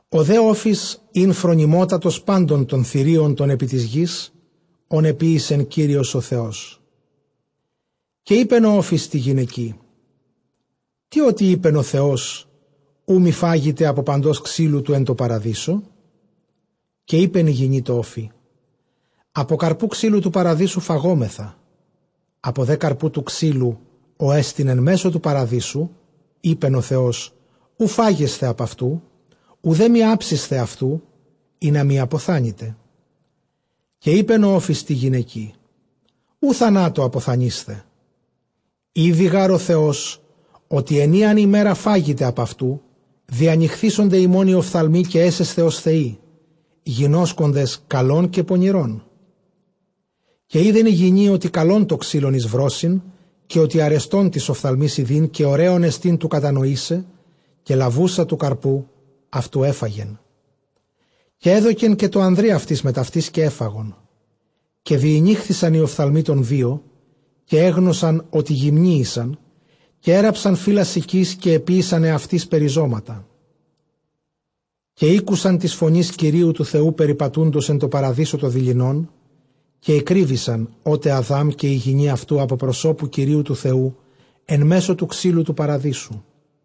Ὁ δὲ ὄφις ἦν φρονιμώτατος πάντων τῶν θηρίων τῶν ἐπὶ τῆς γῆς, ὧν ἐποίησε Κύριος ὁ Θεός· καὶ εἶπεν ὁ ὄφις τῇ γυναικὶ, τί ὅτι εἶπεν ὁ Θεός, οὐ μὴ φάγητε ἀπὸ παντὸς ξύλου τοῦ παραδείσου; Καὶ εἶπεν ἡ γυνὴ τῷ ὄφει, ἀπὸ καρποῦ τοῦ ξύλου τοῦ παραδείσου φαγούμεθα· Ἀπὸ δὲ τοῦ καρποῦ τοῦ ξύλου, ὅ ἐστιν ἐν μέσῳ τοῦ παραδείσου, εἶπεν ὁ Θεός, οὐ φάγεσθε ἀπʼ αὐτοῦ, οὐδὲ μὴ ἅψησθε αὐτοῦ, ἵνα μὴ ἀποθάνητε. Καὶ εἶπεν ὁ ὄφις τῇ γυναικί· οὐ θανάτῳ ἀποθανεῖσθε· Ἤδει γὰρ ὁ Θεὸς, ὅτι ᾗ ἂν ἡμέρᾳ φάγητε ἀπʼ αὐτοῦ, διανοιχθήσονται ὑμῶν οἱ ὀφθαλμοί, καὶ ἔσεσθε ὡς θεοί, γινώσκοντες καλὸν καὶ πονηρόν. Καὶ εἶδεν ἡ γυνὴ, ὅτι καλὸν τὸ ξύλον εἰς βρῶσιν, καὶ ὅτι ἀρεστὸν τοῖς ὀφθαλμοῖς ἰδεῖν, καὶ ὡραῖόν ἐστι τοῦ κατανοῆσαι· καὶ λαβοῦσα ἀπὸ τοῦ καρποῦ αὐτοῦ, ἔφαγε· καὶ ἔδωκε καὶ τῷ ἀνδρὶ αὐτῆς μετʼ αὐτῆς, καὶ ἔφαγον. Καὶ διηνοίχθησαν οἱ ὀφθαλμοὶ τῶν δύο, καὶ ἔγνωσαν ὅτι γυμνοὶ ἦσαν· καὶ ἔῤῥαψαν φύλλα συκῆς, καὶ ἐποίησαν ἑαυτοῖς περιζώματα. Καὶ ἤκουσαν τὴς φωνὴς Κυρίου τοῦ Θεοῦ περιπατοῦντος ἐν τῷ παραδείσῳ τὸ δειλινόν· καὶ ἐκρύβησαν ὅ, τε Ἀδὰμ καὶ ἡ γυνὴ αὐτοῦ ἀπὸ προσώπου Κυρίου τοῦ Θεοῦ ἐν μέσῳ τοῦ ξύλου τοῦ παραδείσου.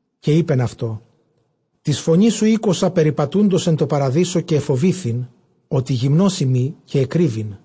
Καὶ εἶπεν αὐτῷ· τὴς φωνῆς σου ἤκουσα περιπατοῦντος ἐν τῷ παραδείσῳ, καὶ ἐφοβήθην ὅτι γυμνός εἰμι, καὶ ἐκρύβην.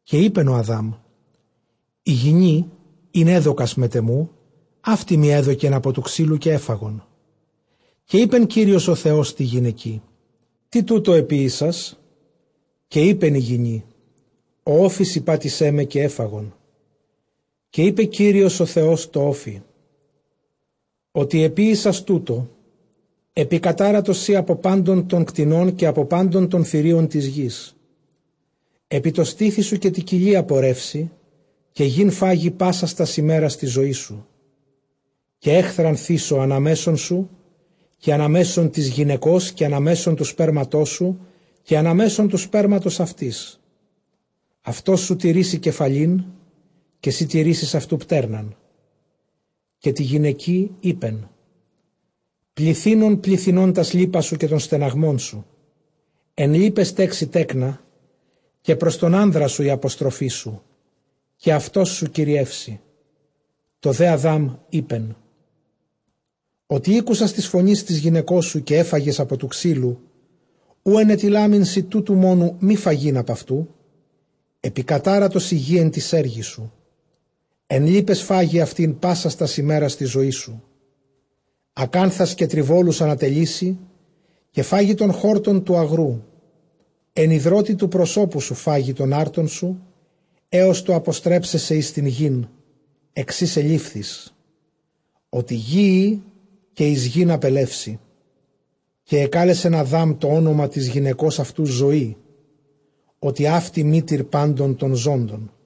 Καὶ εἶπεν ὁ Ἀδάμ· ἡ γυνή, ἣν ἔδωκας μετʼ ἐμοῦ, αὕτη μοι ἔδωκεν ἀπὸ τοῦ ξύλου, καὶ ἔφαγον. Καὶ εἶπε Κύριος ὁ Θεὸς τῇ γυναικί· τί τοῦτο ἐποιήσας; καὶ εἶπεν ἡ γυνὴ, ὁ ὄφις ἠπάτησέ με, καὶ ἔφαγον. Καὶ εἶπε Κύριος ὁ Θεὸς τῷ ὄφει· ὅτι ἐποίησας τοῦτο, ἐπικατάρατος σὺ ἀπὸ πάντων τῶν κτηνῶν, καὶ ἀπὸ πάντων τῶν θηρίων τῶν ἐπὶ τῆς γῆς· ἐπὶ τῷ στήθει σου καὶ τῇ κοιλίᾳ πορεύσῃ, καὶ γῆν φαγῃ πάσας τὰς ἡμέρας τῆς ζωῆς σου. Καὶ ἔχθραν θήσω ἀνὰ μέσον σοῦ καὶ ἀνὰ μέσον τῆς γυναικὸς, καὶ ἀνὰ μέσον τοῦ σπέρματός σου, καὶ ἀνὰ μέσον τοῦ σπέρματος αὐτῆς· αὐτός σοῦ τηρήσει κεφαλὴν, καὶ σὺ τηρήσεις αὐτοῦ πτέρναν. Καὶ τῇ γυναικὶ εἶπε· πληθύνων πληθυνῶ τὰς λύπας σου, καὶ τὸν στεναγμόν σου· ἐν λύπαις τέξῃ τέκνα, καὶ πρὸς τὸν ἄνδρα σου ἡ ἀποστροφή σου· καὶ αὐτός σου κυριεύσει. Τῷ δὲ Ἀδὰμ εἶπεν· ὅτι ἤκουσας τῆς φωνῆς τῆς γυναικός σου, καὶ ἔφαγες ἀπὸ τοῦ ξύλου, οὗ ἐνετειλάμην σοι τούτου μόνου μὴ φαγεῖν, ἀπʼ αὐτοῦ ἔφαγες, ἐπικατάρατος ἡ γῆ ἐν τοῖς ἔργοις σου· ἐν λύπαις φάγῃ αὐτὴν πάσας τὰς ἡμέρας τῆς ζωῆς σου. Ἀκάνθας καὶ τριβόλους ἀνατελεῖ σοι, καὶ φαγῇ τὸν χόρτον τοῦ ἀγροῦ. Ἐν ἱδρῶτι τοῦ προσώπου σου φαγῃ τὸν ἄρτον σου, ἕως τοῦ ἀποστρέψαι σε εἰς τὴν γῆν ἐξ ἧς ἐλήμφθης· ὅτι γῆ εἶ, καὶ εἰς γῆν ἀπελεύσῃ. Καὶ ἐκάλεσεν Ἀδὰμ τὸ ὄνομα τῆς γυναικὸς αὐτοῦ Ζωή, ὅτι μήτηρ πάντων τῶν ζώντων.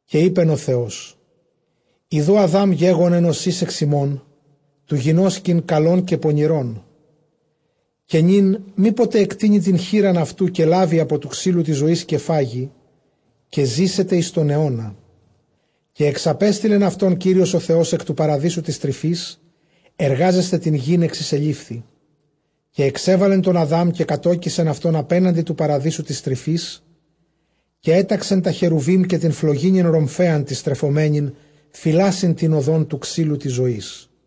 Καὶ εἶπεν ὁ Θεός, ἰδοὺ Ἀδὰμ γέγονεν ὡς εἷς ἐξ ἡμῶν, τοῦ γινώσκειν καλὸν καὶ πονηρόν· καὶ νῦν μή ποτε ἐκτείνῃ τὴν χεῖρα αὐτοῦ, καὶ λάβῃ τοῦ ξύλου τῆς ζωῆς καὶ φάγῃ, καὶ ζήσεται εἰς τὸν αἰῶνα. Καὶ ἐξαπέστειλεν αὐτὸν Κύριος ὁ Θεὸς ἐκ τοῦ παραδείσου τῆς τρυφῆς, ἐργάζεσθαι τὴν γῆν ἐξ ἧς ἐλήμφθη. Καὶ ἐξέβαλεν τὸν Ἀδὰμ, καὶ κατῴκισεν αὐτὸν ἀπέναντι τοῦ παραδείσου τῆς τρυφῆς· καὶ ἔταξε τὰ χερουβὶμ· καὶ τὴν φλογίνην ῥομφαίαν τὴν στρεφομένην, φυλάσσειν τὴν ὁδὸν τοῦ ξύλου τῆς ζωῆς.